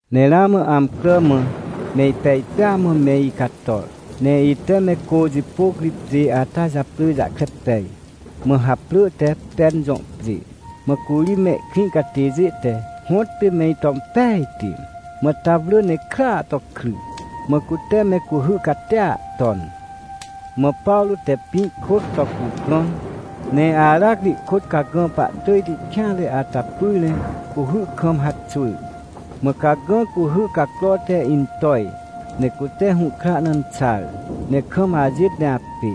Ne ramã amcrà mã me ipej pêa mã me icator, ne ite me cô jipôc ri pjê ata japrỳ jahkre pej, mã haprỳ te Pen jõ pjê. Mã curi mehkrĩ catêjê te hõtpê me ito impejti. Mã ta wrỳ ne krya to kry, mã cute me cuhy catia ton. Mã Pawrô te pĩ kwỳc to cuprõn, ne aracri ihkôt cagã pahtỳjti kêanre ata pyr ne cuhy kam haxwỳr, mã cagã cuhy cacro te intoj, ne cute hũhkra na inxar, ne kam ajêt ne apê.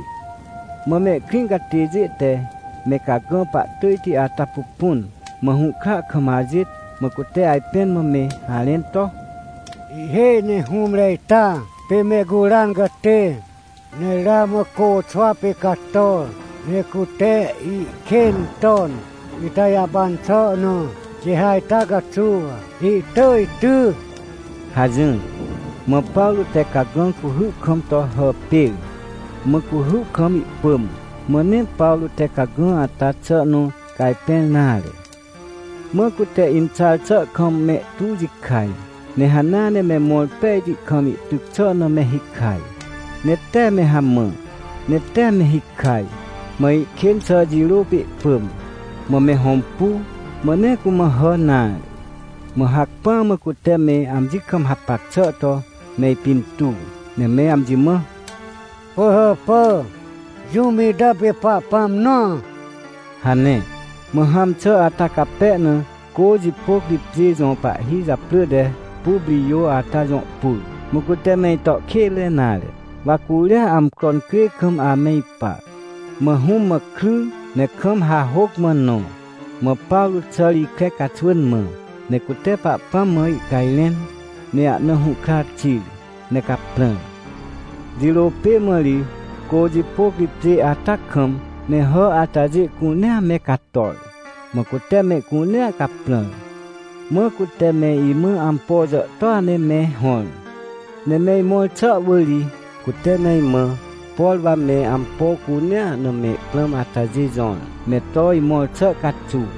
Mã mehkrĩ catêjê te me cagã pahtỳjti ata pupun, mã hũhkra kam ajêt, mã cute ajpẽn mã me harẽn to: — Ihhêj ne hũmre ita pê mehcuran catê. Ne ramã côxwa pê cator, ne cute ihkên ton ita jahpan xà na, quê ha ita caxuw ihtỳj ty — hajỹr. Mã Pawrô te cagã cuhy kam to hàpêr, mã cuhy kam ihpỳm, mã nee Pawrô te cagã ata xà nõ cajpẽr nare. Mã cute inxar xà kam mehtu jikaj, ne hanea ne mõr pejti kam ihtyc xà na me hikaj. Ne tee me hamã, ne tee me hikaj, mã ihkên xà jirô pê ihpỳm, mã me hõmpu, mã nee cumã hà nare. Mã hacpỹa mã cute me amji kam hapac xà to me ipintuw, ne me amji mã: — Pỳhàpà, jũm ita pê pahpãm nõa — hane. Mã hãm xà ata cape na, cô jipôc ri pjê jõ pahhi japrỳ te Puprijô ata jõ pur. Mã cute me ito kênre nare, wa curia amcro incrê kam ame ipa. Mã hũm mã kry, ne kam hahôc mã nõ, mã Pawrô xàr ikre caxwỳn mã, ne cute Pahpãm mã ihcajrẽn, ne ahna hũhkra xir, ne caprãr. Jirô pê mã ri, cô jipôc ri pjê ata kam me hà atajê cunea me cator, mã cute mehcunea caprãr. Mã cute me imã ampo jàhtôa ne me hõr. Ne me imõr xà wỳr ri, cute me imã, por wa me ampo cunea na me prãm atajê jõr, me to imõr xà caxuw.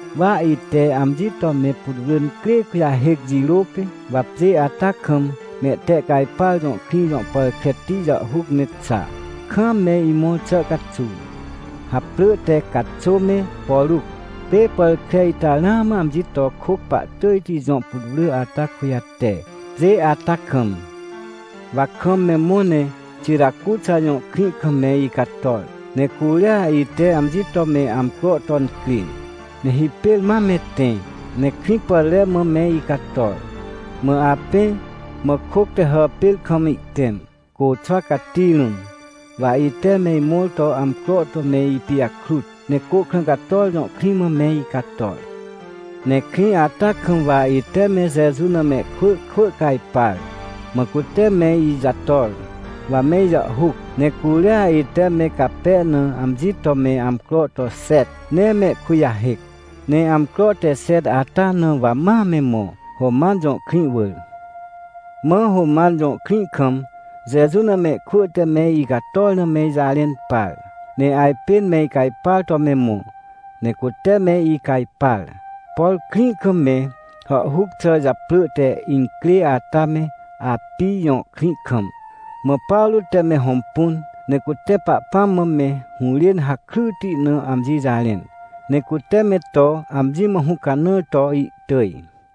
Wa ite amji to me putwrỳ incrê kujahêc jirô pê mã, wa pjê ata kam Mehtehcajpar jõ krĩ jõ pàr kreti jàhhuc ne xa, kaam me imõr xà caxuw, haprỳ te Caxô me Poruc. Pê pàr kre ita ramã amji to kôc pahtỳjti jõ putwrỳ ata kujate, pjê ata kam. Wa kam me mõ ne Xiracuxa jõ krĩ kam me icator, ne curia ite amji to me amcro to incrê. Ne hipêr ma me tẽ, ne Krĩpàtre mã me icator. Mã apẽ, mã kôc te hàpêr kam ihtẽm, côxwa cati rũm, wa ite me imõr to amcro to me ipijakrut, ne Côhkrãcator jõ krĩ mã me icator. Ne krĩ ata kam wa ite me Jeju na mehkwỳ kwỳ cajpar, mã cute me ijator, wa me ijàhhuc, ne curia ite me cape na amji to me amcro to xet ne mehkujahêc. Ne amcro te xet ata na wa ma me mõ, Roman jõ krĩ wỳr. Mã Roman jõ krĩ kam Jeju na mehkwỳ te me icator na me ijarẽn par, ne ajpên me icajpar to me mõ. Ne cute me icajpar, por krĩ kam me hàhhuc xà japrỳ te Incrê ata me Apij jõ krĩ kam. Mã Pawrô te me hõmpun, ne cute Pahpãm mã me hũrên hakryti na amji jarẽn, ne cute me to amji mã hũcanãr to ihtỳj.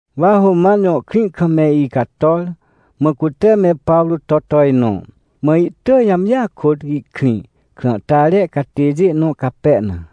Wa Roman jõ krĩ kam me icator, mã cute me Pawrô to tojnõ, mã ihtỳj amjia kôt ihkrĩ, krãhtare catêjê nõ cape na.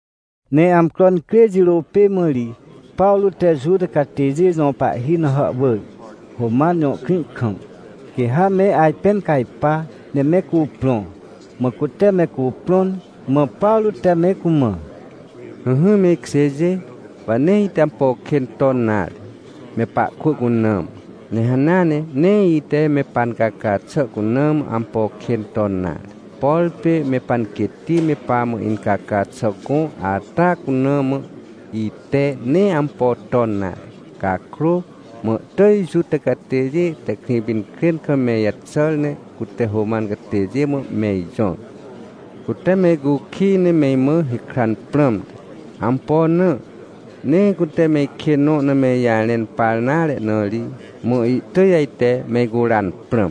Ne amcro incrê jirô pê mã ri, Pawrô te Juta catêjê jõ pahhi na hàhwỳr, Roman jõ krĩ kam, quê ha me ajpẽn cajpa, ne me cuprõ. Mã cute me cuprõn, mã Pawrô te me cumã: — Ỹhỹ, me ikjêjê, wa nee ite ampo kên ton nare, me pahkwỳ cuna mã, ne hanea nee ite me pancaca xà cuna mã ampo kên ton nare, por pê me panquêtti me pamã incaca xà gõ ata cuna mã ite nee ampo ton nare. Cakrô mã ihtỳj Juta catêjê te Krĩpinkrên kam me ijaxàr, ne cute Roman catêjê mã me ijõr. Cute me icukij, ne me imã hikran prãmte. Ampo na? Nee cute me ikên nõ na me ijarẽn par nare na ri, mã ihtỳj ajte me icuran prãm.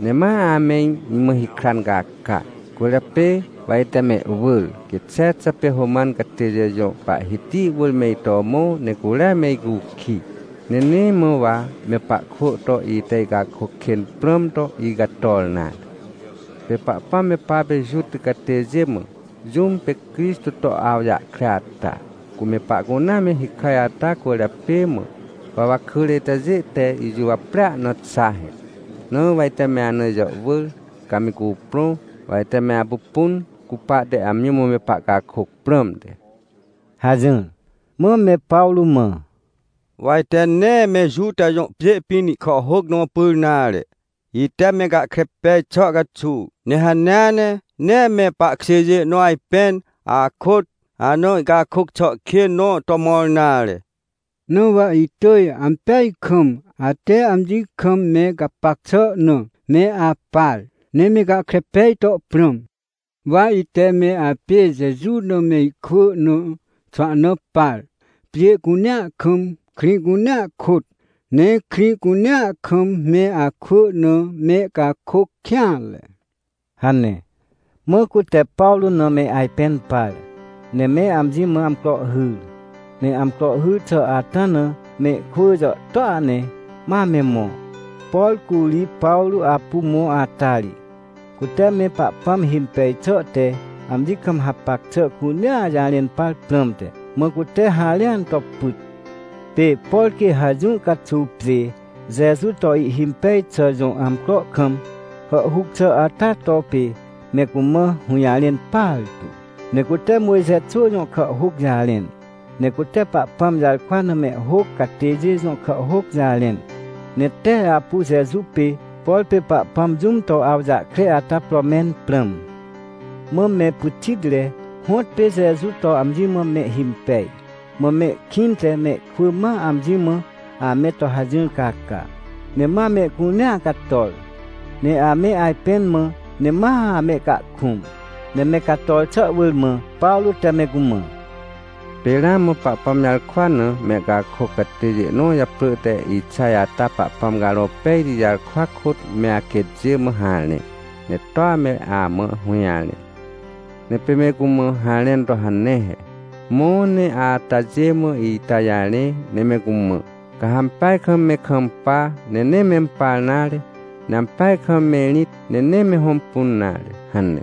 Ne ma ame imã hikran caca. Cwỳrjapê wa ite mehwỳr, quê Xexa pê Roman catêjê jõ pahhiti wỳr me ito mõ ne curia me icukij. Ne nee mã wa me pahkwỳ to ite icakôc kên prãm to icator nare. Pê Pahpãm me papê Juta catêjê mã, jũm pê Crixtô to awjahkre ata, cu me pahcunea me hikaj ata cwỳrjapê mã, wa wakỳre itajê te ijuwaprea na xa he. Na wa ite me ana ijàhwỳr, ca me cuprõ, wa ite me apupun, cupahte amji mã me pahcakôc prãmte — hajỹr. Mã me Pawrô mã: — Wa ite nee me Juta jõ pjê pĩn ihkàhhôc nõ pyr nare, ite me gahkre pej xà caxuw. Ne hanea ne, nee me pahkjêjê nõ ajpên akôt ana ihcakôc xà kên nõ to mõr nare. Na wa itỳj ampeaj kam, ate amji kam me gapac xà na me apar, ne me gahkre pej to prãm. Wa ite me apê Jeju na mehkwỳ na xwahna par, pjê cunea kam, krĩ cunea kôt, ne krĩ cunea kam me akwỳ na mehcakôc kêanre — hane. Mã cute Pawrô na me ajpẽn par, ne me amji mã amcro hyr. Ne amcro hyr xà ata na mehkwỳ jàhtôa ne ma me mõ, por curi Pawrô apu mõ ata ri. Cute me Pahpãm himpej xà te amji kam hapac xà cunea jarẽn par prãmte. Mã cute harẽan to pyt. Pê por quê ha jũ caxuw pjê Jeju to ihhimpej xà jõ amcro kam hàhhuc xà ata to pê me cumã hũjarẽn partu. Ne cute Mojxe xwỳ jõ kàhhôc jarẽn, ne cute Pahpãm jarkwa na mehhôc catêjê jõ kàhhôc jarẽn, ne tee apu Jeju pê, por pê Pahpãm jũm to awjahkre ata pro mẽn prãm. Mã me pyxitre hõtpê Jeju to amji mã mehhimpej, mã mehkĩnte mehkwỳ ma amji mã ame to hajỹr caca. Ne ma mehcunea cator, ne ame ajpẽn mã, ne ma amehcahkũm. Ne me cator xà wỳr, mã Pawrô te me cumã: — Pê ramã Pahpãm jarkwa na mehcakôc catêjê nõ japrỳ te Ixaj ata Pahpãm Carõ Pejti jarkwa kôt me aquêtjê mã harẽ. Ne toa me amã hũjarẽ. Ne pê me cumã harẽn to hane he: “Mõ, ne atajê mã ita jarẽ, ne me cumã: ‘Ca ha ampeaj kam me kampa, ne nee mempar nare, ne ampeaj kam me rĩt, ne nee me hõmpun nare’ hane.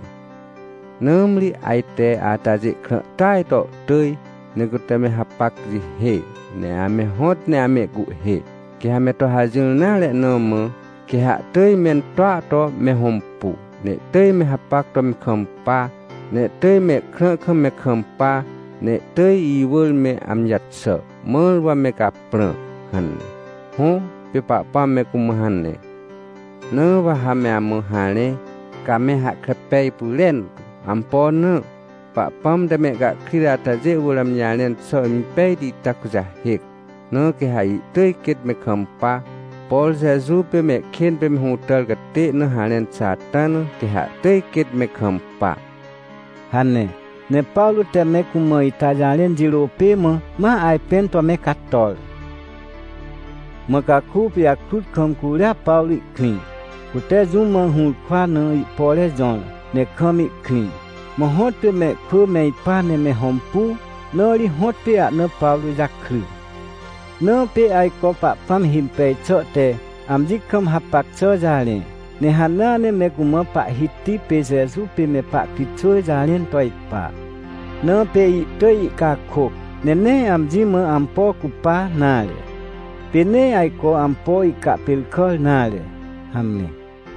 Nãmri ajte atajê krã tỳaj to ihtỳj, ne cute me hapac jihê, ne ame hõt ne amehcuhhê. Quê ha me to hajỹr nare na mã, quê ha ihtỳj mentoa to me hõmpu, ne ihtỳj me hapac to me kampa, ne ihtỳj mehkrã kam me kampa, ne ihtỳj iwỳr me amji jaxà, mãr wa me caprã” hane. Hõ, pê Pahpãm me cumã hane. — Na wa ha me amã harẽ, ca me hahkre pej pyrentu. Ampo na? Pahpãm te mehcahkrit atajê wỳr amji jarẽn xà impejti ita kujahêc. Na quê ha ihtỳj quêt me kampa. Por Jeju pê mehkên pê me hũtàr catê na harẽn xà ata na, quê ha ihtỳj quêt me kampa — hane. Ne Pawrô te me cumã ita jarẽn jirô pê mã ma ajpẽn to me cator. Mã caku pijakrut kam curia Pawrô ihkrĩ. Cute jũm mã hũrkwa na ihpore jõr, ne kam ihkrĩ. Mã hõtpê mehkwỳ me ipa ne me hõmpu, na ri hõtpê ahna Pawrô jakry. Na pê ajco Pahpãm himpej xà te amji kam hapac xà jarẽ, ne hanea ne me cumã Pahhiti pê Jeju pê me pahkritxwỳ jarẽn to ipa. Na pê ihtỳj ihcakôc, ne nee amji mã ampo cupa nare, pê nee ajco ampo ihcahpêrkàr nare. Hamre.